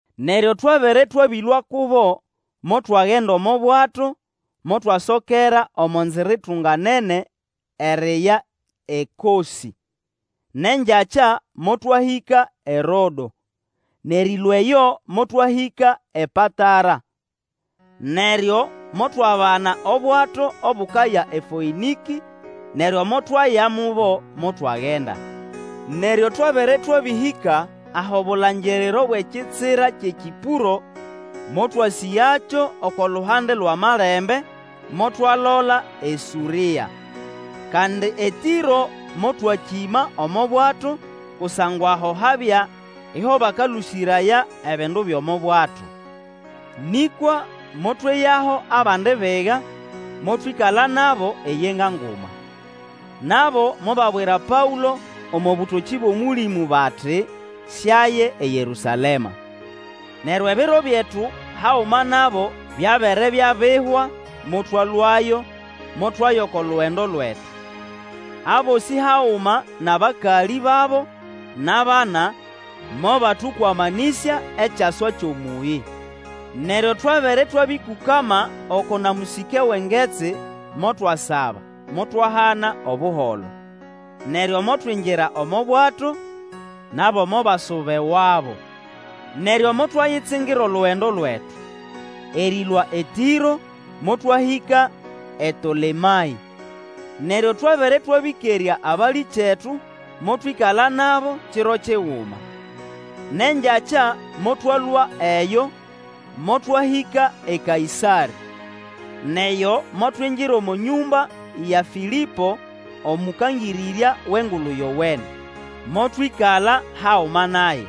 Neryo twabere twabĩlũa kubo, motwagenda omo bwato, motwasokera omo nzira itunganene eriya eKosĩ, nʼengyakya motwahĩka eRodo, nʼerĩlũa eyo motwahĩka ePatara. Neryo motwabana obwato obukaya eFoĩnĩkĩ, neryo motwaya mubo, motwagenda. Neryo twabere twabĩhĩka ahʼobulangiriro bwʼekitsira kyʼeKĩpũro, motwasĩgakyo oko luhande lwʼamalembe, motwalola eSũrĩa. Kandi eTĩro motwakĩma omo bwato, kusangwa aho habya iho bakalũsĩraya ebindu byʼomo bwato. Nĩkwa motweyaho abandi biga, motwĩkala nabo eyenga nguma. Nabo mobabwira Paũlo omo bũtokĩ bwʼOmũlĩmũ bati siaye eYerũsalema. Neryo ebiro byetu haguma nabo byabere byabihwa, motwalũayo, motwaya oko lugendo lwetu. Abosĩ haguma nʼabakalĩ babo nʼabana mobatũkwamanĩsya ekyaswa kyʼomũyĩ. Neryo twabere twabĩkũkama oko na mũsĩke wʼengetsi, motwasaba, motwahana Obuholo. Neryo motwingira omo bwato, nabo mobasuba ewabo. Neryo motwayitsingira olugendo lwetu. Erĩlũa eTĩro motwahĩka eTolemaĩ, neryo twabere twabĩkerya abalĩkyetu, motwĩkala nabo kiro kiguma. Nʼengyakya motwalũa eyo, motwahĩka eKaĩsarĩ. Nʼeyo motwingira omo nyũmba ya Fĩlĩpo, omũkangĩrĩrya wʼEngulu Yowene, motwĩkala haguma naye.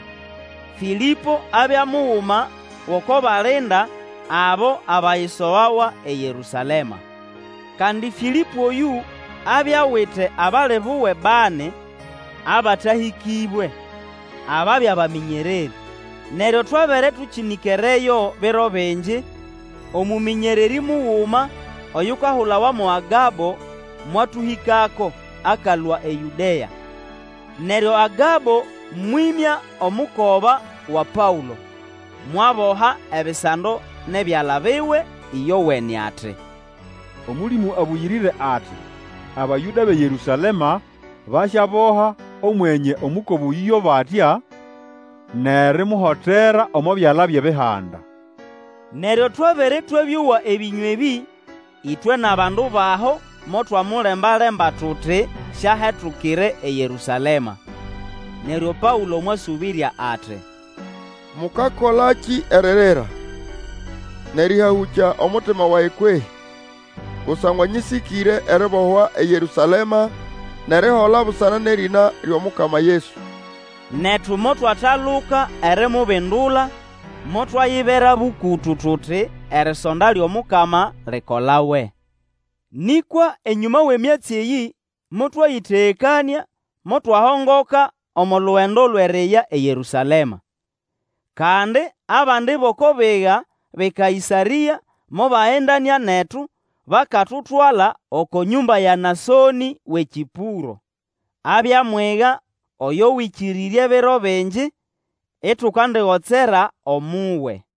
Fĩlĩpo abya muguma gʼoko balinda abo abayisogawa eYerũsalema. Kandi Fĩlĩpo oyũ abya awite abali buwe bani abatahĩkĩbwe, ababya bamĩnyererĩ. Neryo twabere tũnĩkereyo biro bingi, omũmĩnyererĩ muguma oyukahulawa mo Agabo mwatũhĩkako, akalũa eYũdea. Neryo Agabo mwĩmya omukoba wa Paũlo, mwaboha ebisando nʼebyala biwe ĩyowene, ati, Omũlĩmũ Abũyĩrĩre ati, Abayũda bʼeYerũsalema basyaboha Omwenye omukoba oyũ yo batya, nʼerimuhotera omo byala byʼEbihanda. Neryo twabere twabĩowa ebĩnya ebĩ, ĩtwe nʼabandu baho motwamulemba-lemba tuti siahetukire eYerũsalema. Neryo Paũlo mwasũbĩrya ati, Mũkakolakĩ eririra, nʼerĩhahũkya omutima wage kwehĩ? Kusangwa nyĩsĩkĩre eribohwa eYerũsalema nʼerihola busana nʼerĩna lyʼomukama Yesu. Netu motwataluka erimubindula, motwayibera bũkũtũ tuti, Erisonda lyʼomukama likolawe. Nĩkwa enyũma wʼemyatsi eyĩ motwayĩtegekanĩa, motwahongoka omo lugendo lwʼeriya eYerũsalema. Kandi abandi bʼoko biga bʼeKaĩsarĩa mobagendanĩa netu, bakatutwala oko nyũmba ya Nasonĩ wʼeKĩpũro. Abya mwiga oyo Wĩkĩrĩrye biro bingi, itukandigotsera omuwe.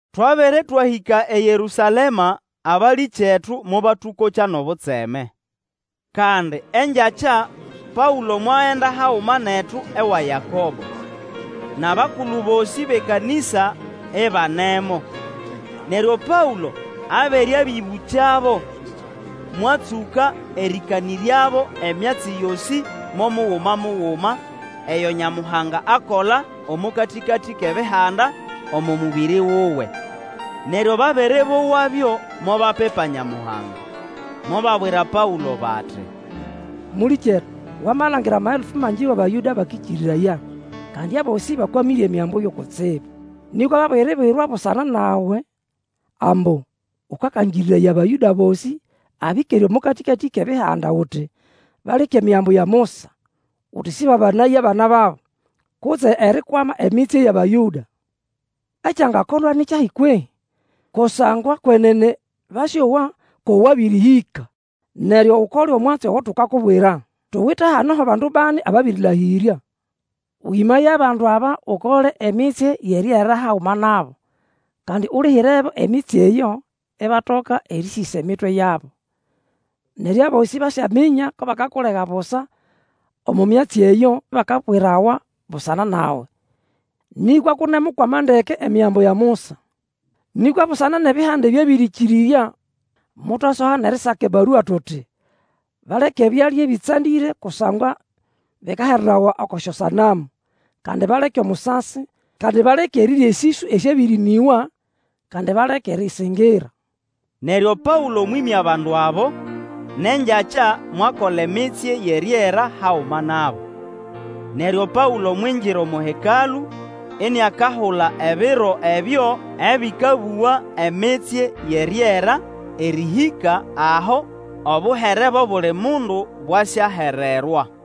Twabere twahĩka eYerũsalema, abalĩkyetu mobatũkokya nʼobutseme. Kandi engyakya Paũlo mwagenda haguma netu ewa Yakobo, nʼabakulu bosĩ bʼekanĩsa ibanemo. Neryo Paũlo abere abĩbũkyabo, mwatsũka erĩkanĩryabo emyatsi yosĩ mo muguma muguma eyo Nyamuhanga akola omo katĩkatĩ kʼEbihanda omo mũbĩrĩ wuwe. Neryo babere bowabyo, mobapipa Nyamuhanga. Mobabwira Paũlo bati, Mũlĩkyetu Wamalangira amaelfu mangi wʼAbayũda ababĩrĩkĩrĩrya, kandi abosĩ bakwamĩre Emigambo yo kutsibu. Nĩkwa babiribwirwa busana nawe ambu ũkakangĩrĩraya Abayũda bosĩ abĩkere omo katĩkatĩ kʼEbihanda, uti, baleke Emigambo ya Musa, uti sĩbabanaye abana babo, kutse erikwama emitsye yʼAbayũda. Ekyangakolwa ni kyahi kwehĩ? Kusangwa kwenene basyowa ko wabĩrĩhĩka. Neryo Ukole omwatsi ogo tukakubwira. Tuwite hano ho bandu bani ababĩrĩlahĩrya. Wĩmaye abandu aba Ukole emitsye yʼeriera haguma nabo, kandi ulihirebo emitsye eyo, ibatoka erĩsĩsa emitwe yabo. Neryo abosĩ basyaminya ko bakakulega busa omo myatsi eyo bakabwirawa busana nawe, nĩkwa kʼunemukwama ndeke Emigambo ya Musa. Nĩkwa busana nʼEbihanda ebyabĩrĩkĩrĩrya, motwasoha nʼerisaka ebarua tuti, Baleke ebyalya ebĩtsandĩre kusangwa bikaherawa oko syosanamu, kandi baleke omusasi, kandi baleke erirya esĩswĩ esyabĩrĩnĩgwa, kandi baleke erĩsĩngĩra. Neryo Paũlo mwĩmya bandu abo, nʼengyakya mwakola emitsye yʼeriera haguma nabo. Neryo Paũlo mwingira omo Hekalũ, iniakahula ebiro ebyo ebikabuga emitsye yʼeriera, erĩhĩka aho obuhere bwʼobuli mundu bwasyahererwa.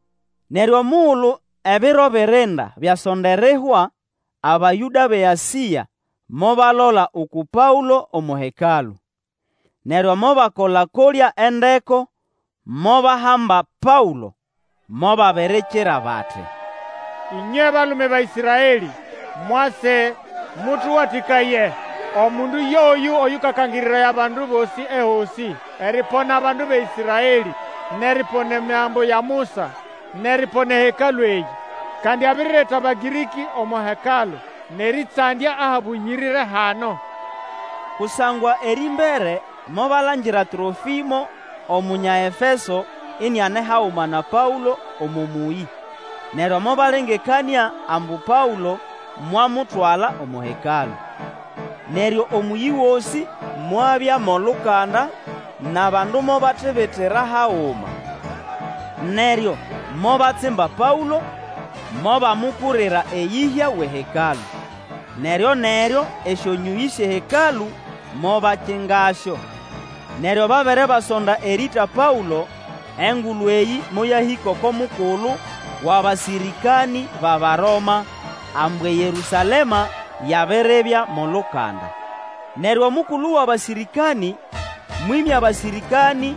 Neryo omugulu ebiro birinda byasonda erihwa, Abayũda bʼeAsĩa mobalola uku Paũlo omo Hekalũ. Neryo mobakola-kolya endeko, mobahamba Paũlo. Mobabirikira bati, Ĩnywe balume ba Ĩsraelĩ! Mwase, mũtũwatĩkaye! Omundu yoyũ oyũkakangĩrĩraya abandu bosĩ ehosĩ, eripona bandu ba Ĩsraelĩ, nʼeripona Emigambo ya Musa, nʼeripona eHekalũ eyĩ. Kandi abirireta Abagĩrĩkĩ omo Hekalũ, nʼerĩtsandya ahabũyĩrĩre hano. Kusangwa erĩmbere mobalangira Trofimo Omunya Efeso iniane haguma na Paũlo omo mũyĩ, neryo mobalengekanĩa ambu Paũlo mwamutwala omo Hekalũ. Neryo omũyĩ gosĩ mwabya mʼolukanda, nʼabandu mobatibitira haguma. Neryo mobatsimba Paũlo, mobamukurira eyĩhya wʼeHekalũ. Neryoneryo esyonyũyĩ syʼeHekalũ mobakingasyo. Neryo babere basonda erĩĩta Paũlo, engulu eyĩ moyahĩka oko mukulu wʼabasĩrĩkanĩ bʼAbaroma, ambu eYerũsalema yabiribya mʼolukanda. Neryo omukulu wʼabasĩrĩkanĩ mwĩmya abasĩrĩkanĩ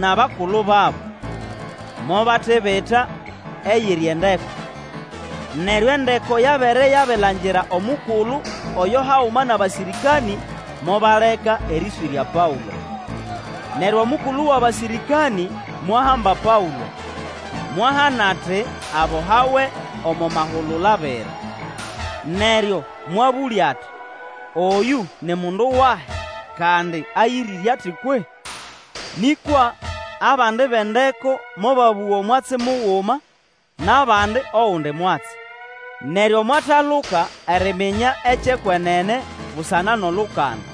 nʼabakulu babo, mobatibita eyiri endeko. Neryo endeko yabere yabilangira omukulu oyo haguma nʼabasĩrĩkanĩ, mobaleka erĩswĩrya Paũlo. Neryo omukulu wʼabasĩrĩkanĩ, mwahamba Paũlo, mwahana ati abohawe omo mahulula abiri. Neryo mwabũlya ati, Oyũ ni mundu wahi, kandi ayĩrĩre ati kwehĩ? Nĩkwa abandi bʼendeko mobabũga mwatsi muguma, nʼabandi ogundi mwatsi. Neryo mwataluka eriminya ekyʼekwenene, busana nʼolukanda,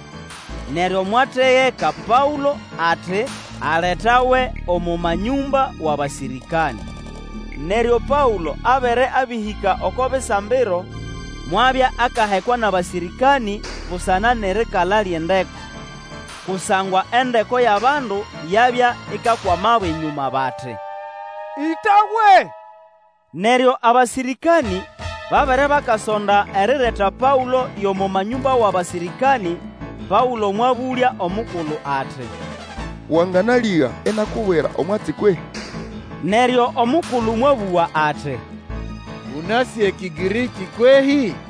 neryo mwategeka Paũlo ati aletawe omo manyũmba wʼabasĩrĩkanĩ. Neryo Paũlo abere abĩhĩka oko bisambiro, mwabya akahekwa nʼabasĩrĩkanĩ busana nʼerikala lyʼendeko. Kusangwa endeko yʼabandu yabya ikakwamabo enyũma bati, Ĩtawe! Neryo abasĩrĩkanĩ babere bakasonda erireta Paũlo yʼomo manyũmba wʼabasĩrĩkanĩ, Paũlo mwabũlya omukulu ati, Wanganalĩga inakubwira omwatsi kwehĩ? Neryo omukulu mwabũga ati, Ũnasĩ eKĩgĩrĩkĩ kwehĩ?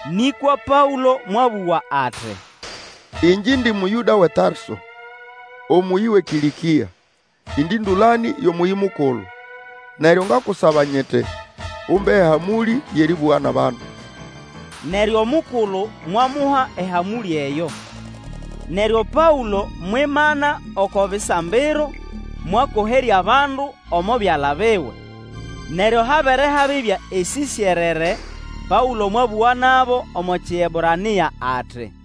Nĩkwa Paũlo mwabũga ati, Ĩngye indi Mũyũda wʼeTarso, omũyĩ wʼeKĩlĩkĩa, indi ndũlanĩ yʼomũyĩ mukulu, neryo ngakusaba nyiti, Umba ehamũlĩ yʼerĩbũga nʼabandu. Neryo omukulu mwamuha ehamũlĩ eyo. Neryo Paũlo mwimana oko bisambiro, mwakoherya abandu omo byala biwe. Neryo habere habibya esĩsyerere, Paũlo mwabũga nabo omo Kiebrania ati,